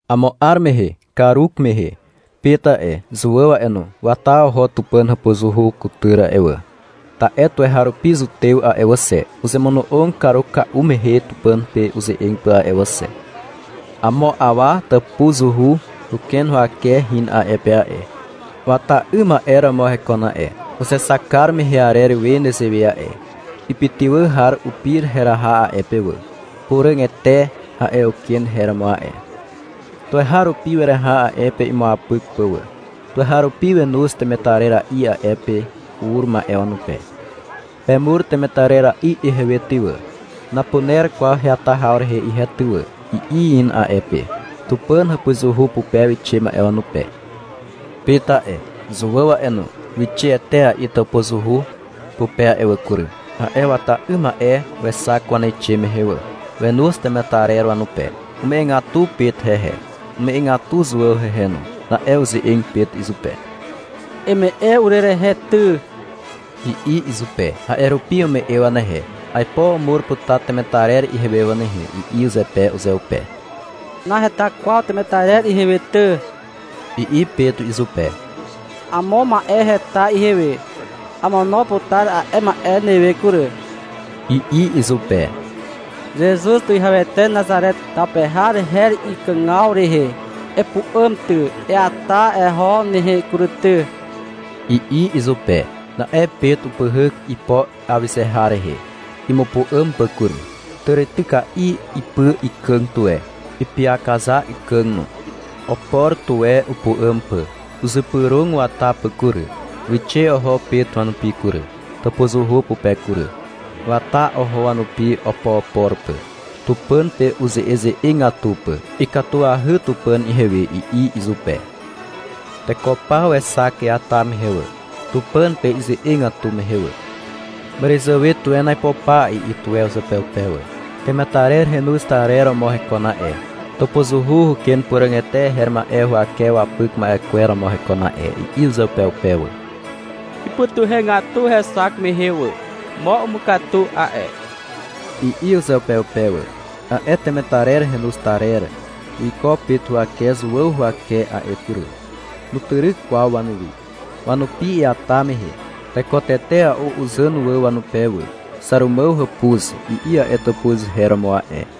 Amo 'ar mehe karumehe, Pet a'e, Zuàw a'e no, wata oho Tupàn hàpuzuhu kutyr a'e wà. Ta'e tuweharupi zutew a'e wà xe, uzemono'og karuka'u mehe Tupàn pe uze'eg pà a'e wà xe. Amo awa tàpuzuhu huken huwake hin a'e pe a'e. Wata 'ym ma'e romo hekon a'e, uzexak kar mehe arer we nezewe a'e. Ipytywà har upir heraha a'e pe wà. — Puràgete, a'e uken her romo a'e. Tuweharupi weraha a'e pe imuapyk pà wà. Tuweharupi wenoz temetarera'i a'e pe ur ma'e wanupe. — Pemur temetarera'i ihewe ty wà, napuner kwaw heata haw rehe ihe ty wà, i'i hin a'e pe, Tupàn hàpuzuhu pupe wixe ma'e wanupe. Pet a'e, Zuàw a'e no, wixe etea'i tàpuzuhu pupe a'e wà kury. A'e wata 'ym ma'e wexak waneixe mehe wà. Wenoz temetarer wanupe. Ume'egatu Pet hehe. Ume'egatu Zuàw hehe no. Na'e uze'eg Pet izupe. -Eme'e urerehe ty, i'i izupe. A'e rupi ume'e wanehe. — Aipo umur putar temetarer ihewe wà nehe, i'i zepe uzeupe. — Naheta kwaw temetarer ihewe ty, i'i Pet izupe. Amo ma'e heta ihewe. Amono putar a'e ma'e newe kury, i'i izupe. — Zezuz Tuwihawete Nazare taw pe har her ikàgaw rehe. Epu'àm ty, eata eho nehe kury ty, i'i izupe. Na'e Pet upyhyk ipo awyze har rehe, imupu'àm pà kury. Tàrityka'i ipy ikàg tuwe, ipyakaza ikàg no. Opor tuwe upu'àm pà, uzypyrog wata pà kury. Wixe oho Pet wanupi kury, tàpuzuhu pupe kury. Wata oho wanupi opoopor pà, Tupàn pe uze'eze'egatu pà. — Ikatuahy Tupàn ihewe, i'i izupe. Teko paw wexak iata mehe wà, Tupàn pe ize'egatu mehe wà. — Màràzàwe tuwen aipo pa, i'i tuwe uzeupeupe wà. — Temetarer henoz tarer romo hekon a'e, tàpuzuhu huken Puràgete her ma'e huwake wapyk ma'e kwer romo hekon a'e, i'i uzeupeupe wà. Ipytuhegatu hexak mehe wà. — Mo umukatu a'e, i'i uzeupeupe wà. A'e temetarer henoz tarer wiko Pet huwake Zuàw huwake a'e kury. Nutyryk kwaw wanuwi. Wanupi iata mehe teko tetea'u uzàn wà wanupe wà. (— Xàrumàw hàpuz, i'i a'e tàpuz her romo a'e.)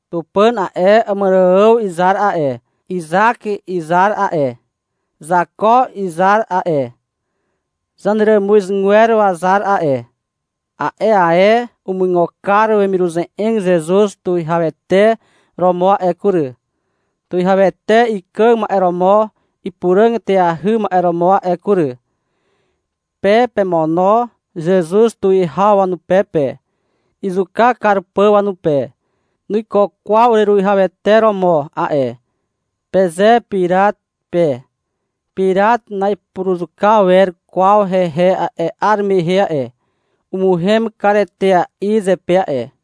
Tupàn a'e, Àmàrààw izar a'e, Izak izar a'e, Zako izar a'e, zaneràmuzgwer wazar a'e, a'e ae umuigo kar wemiruze'eg Zezuz tuwihawete romo a'e kury, tuwihawete ikàg ma'e romo ipuràg eteahy ma'e romo a'e kury. Pe pemono Zezuz tuwihaw wanupe pe, izuka kar pà wanupe. — Nuiko kwaw ureruwihawete romo a'e, peze Pirat pe. Pirat na'ipuruzuka wer kwaw hehe a'e 'ar mehe a'e. Umuhem kar etea'i zepe a'e.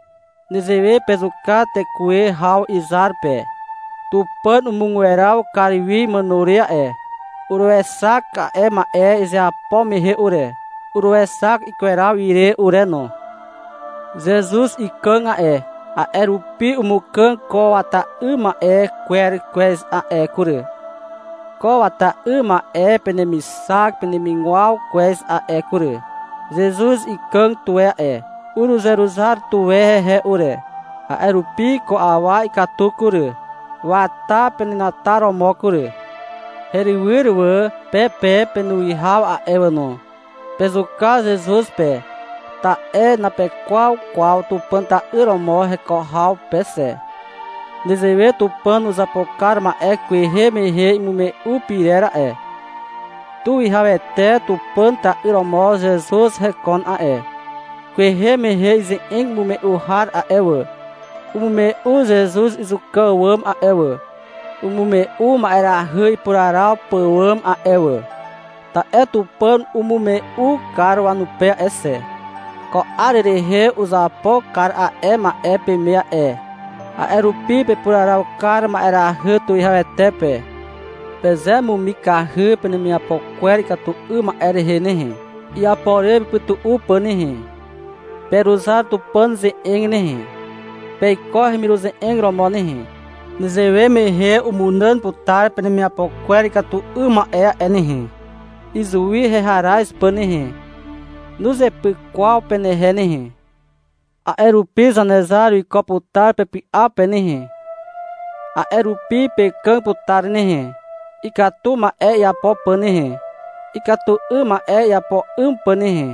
— Nezewe pezuka tekuwe haw izar pe. Tupàn umugweraw kar wi imàno re a'e. Uruexak a'e ma'e izeapo mehe ure. Uruexak ikweraw ire ure no. Zezuz ikàg a'e, a'e rupi umukàg ko wata 'ym ma'e kwer kwez a'e kury, ko wata 'ym ma'e penemixak penemigwaw kwez a'e kury. Zezuz ikàg tuwe a'e. Uruzeruzar tuwe hehe ure. A'e rupi ko awa ikatu kury, wata penenataromo kury. Herywyr wà. Pe pe, penuwihaw a'e wà no, pezuka Zezuz pe, ta'e napekwaw kwaw Tupàn ta'yr romo heko haw pe xe. Nezewe Tupàn uzapo kar ma'e kwehe mehe imume'u pyrer a'e. Tuwihawete Tupàn ta'yr romo Zezuz hekon a'e. Kwehe mehe ize'eg imume'u har a'e wà, umume'u Zezuz izuka àwàm a'e wà, umume'u ma'erahy ipuraraw pàwàm a'e wà. Ta'e Tupàn umume'u kar wanupe a'e xe. Ko 'ar rehe uzapo kar a'e ma'e peme a'e. A'e rupi pepuraraw kar ma'erahy tuwihawete pe. Pezemumikahy penemiapo kwer ikatu 'ym ma'e rehe nehe, iapo re pepytu'u pà nehe. Peruzar Tupàn ze'eg nehe, peiko hemiruze'eg romo nehe. Nezewe mehe umunàn putar penemiapo kwer ikatu 'ym ma'e a'e nehe, izuwi heharaz pà nehe. Nuzepyk kwaw penehe nehe. A'e rupi Zanezar wiko putar pepy'a pe nehe. A'e rupi pekàg putar nehe, ikatu ma'e iapo pà nehe, ikatu 'ym ma'e iapo 'ym pà nehe.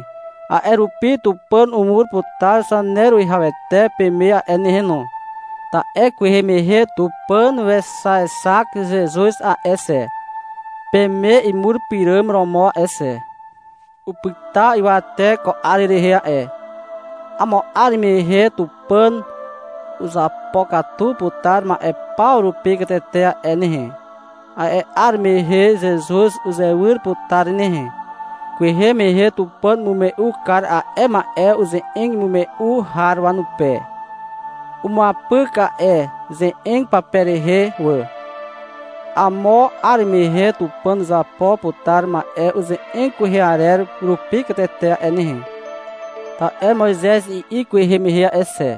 A'e rupi Tupàn umur putar Zaneruwihawete peme a'e nehe no, ta'e kwehe mehe Tupàn wexaexak Zezuz a'e xe, peme imur pyràm romo a'e xe. Upyta ywate ko 'ar rehe a'e. Amo 'ar mehe Tupàn uzapokatu putar ma'e paw rupi katete a'e nehe. A'e 'ar mehe Zezuz uzewyr putar nehe. Kwehe mehe Tupàn umume'u kar a'e ma'e uze'eg imume'u har wanupe. Umuapyk a'e ze'eg pape rehe wà. Amo 'ar mehe Tupàn uzapo putar ma'e uze'eg kwehe arer rupi katete a'e nehe. Ta'e Moizez i'i kwehe mehe a'e xe.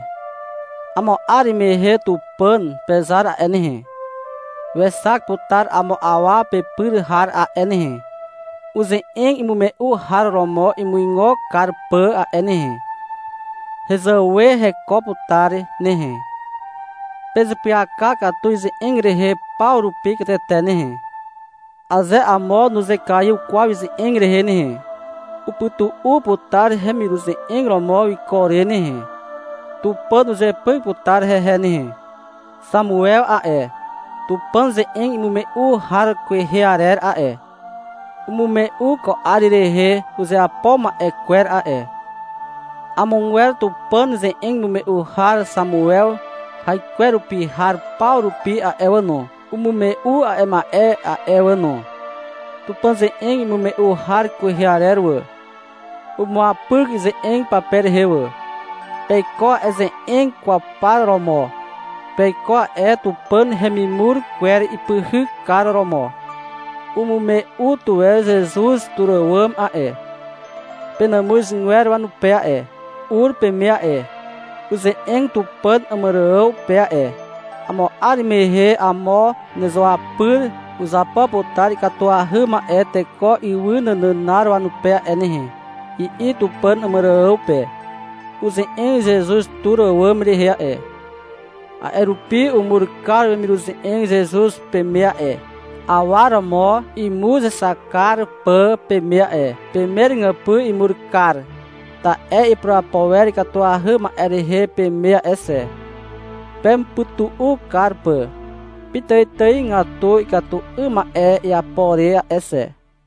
— Amo 'ar mehe Tupàn pezar a'e nehe, wexak putar amo awa pepyr har a'e nehe, uze'eg imume'u har romo imuigo kar pà a'e nehe. Hezàwe hekon putar nehe. Pezeapyaka katu ize'eg rehe paw rupi katete nehe. Aze amo nuzekaiw kwaw ize'eg rehe nehe, upytu'u putar hemiruze'eg romo wiko re nehe. Tupàn uzepyk putar hehe nehe. Xamuew a'e, Tupàn ze'eg imume'u har kwehe arer a'e, umume'u ko 'ar rehe uzeapo ma'e kwer a'e. Amogwer Tupàn ze'eg imume'u har Xamuew haikwerupi har paw rupi a'e wà no, umume'u a'e ma'e a'e wà no. Tupàn ze'eg imume'u har kwehe arer wà, umuapyk ize'eg pape rehe wà. Peiko a'e ze'eg kwaw par romo. Peiko a'e Tupàn hemimur kwer ipyhykar romo. Umume'u tuwe Zezuz tur àwàm a'e, penàmuzgwer wanupe a'e. Ur peme a'e. Uze'eg Tupàn Àmàrààw pe a'e. — Amo 'ar mehe amo nezuapyr uzapo putar ikatuahy ma'e teko ywy nànànar wanupe a'e nehe, i'i Tupàn Àmàrààw pe. Uze'eg Zezuz tur àwàm rehe a'e. A'e rupi umur kar wemiruze'eg Zezuz peme a'e, awa romo imuzexak kar pà peme a'e. Peme ràgypy imur kar. Ta'e ipurapo wer ikatuahy ma'e rehe peme a'e xe, pemupytu'u kar pà pitàitàigatu ikatu 'ym ma'e iapo re a'e xe.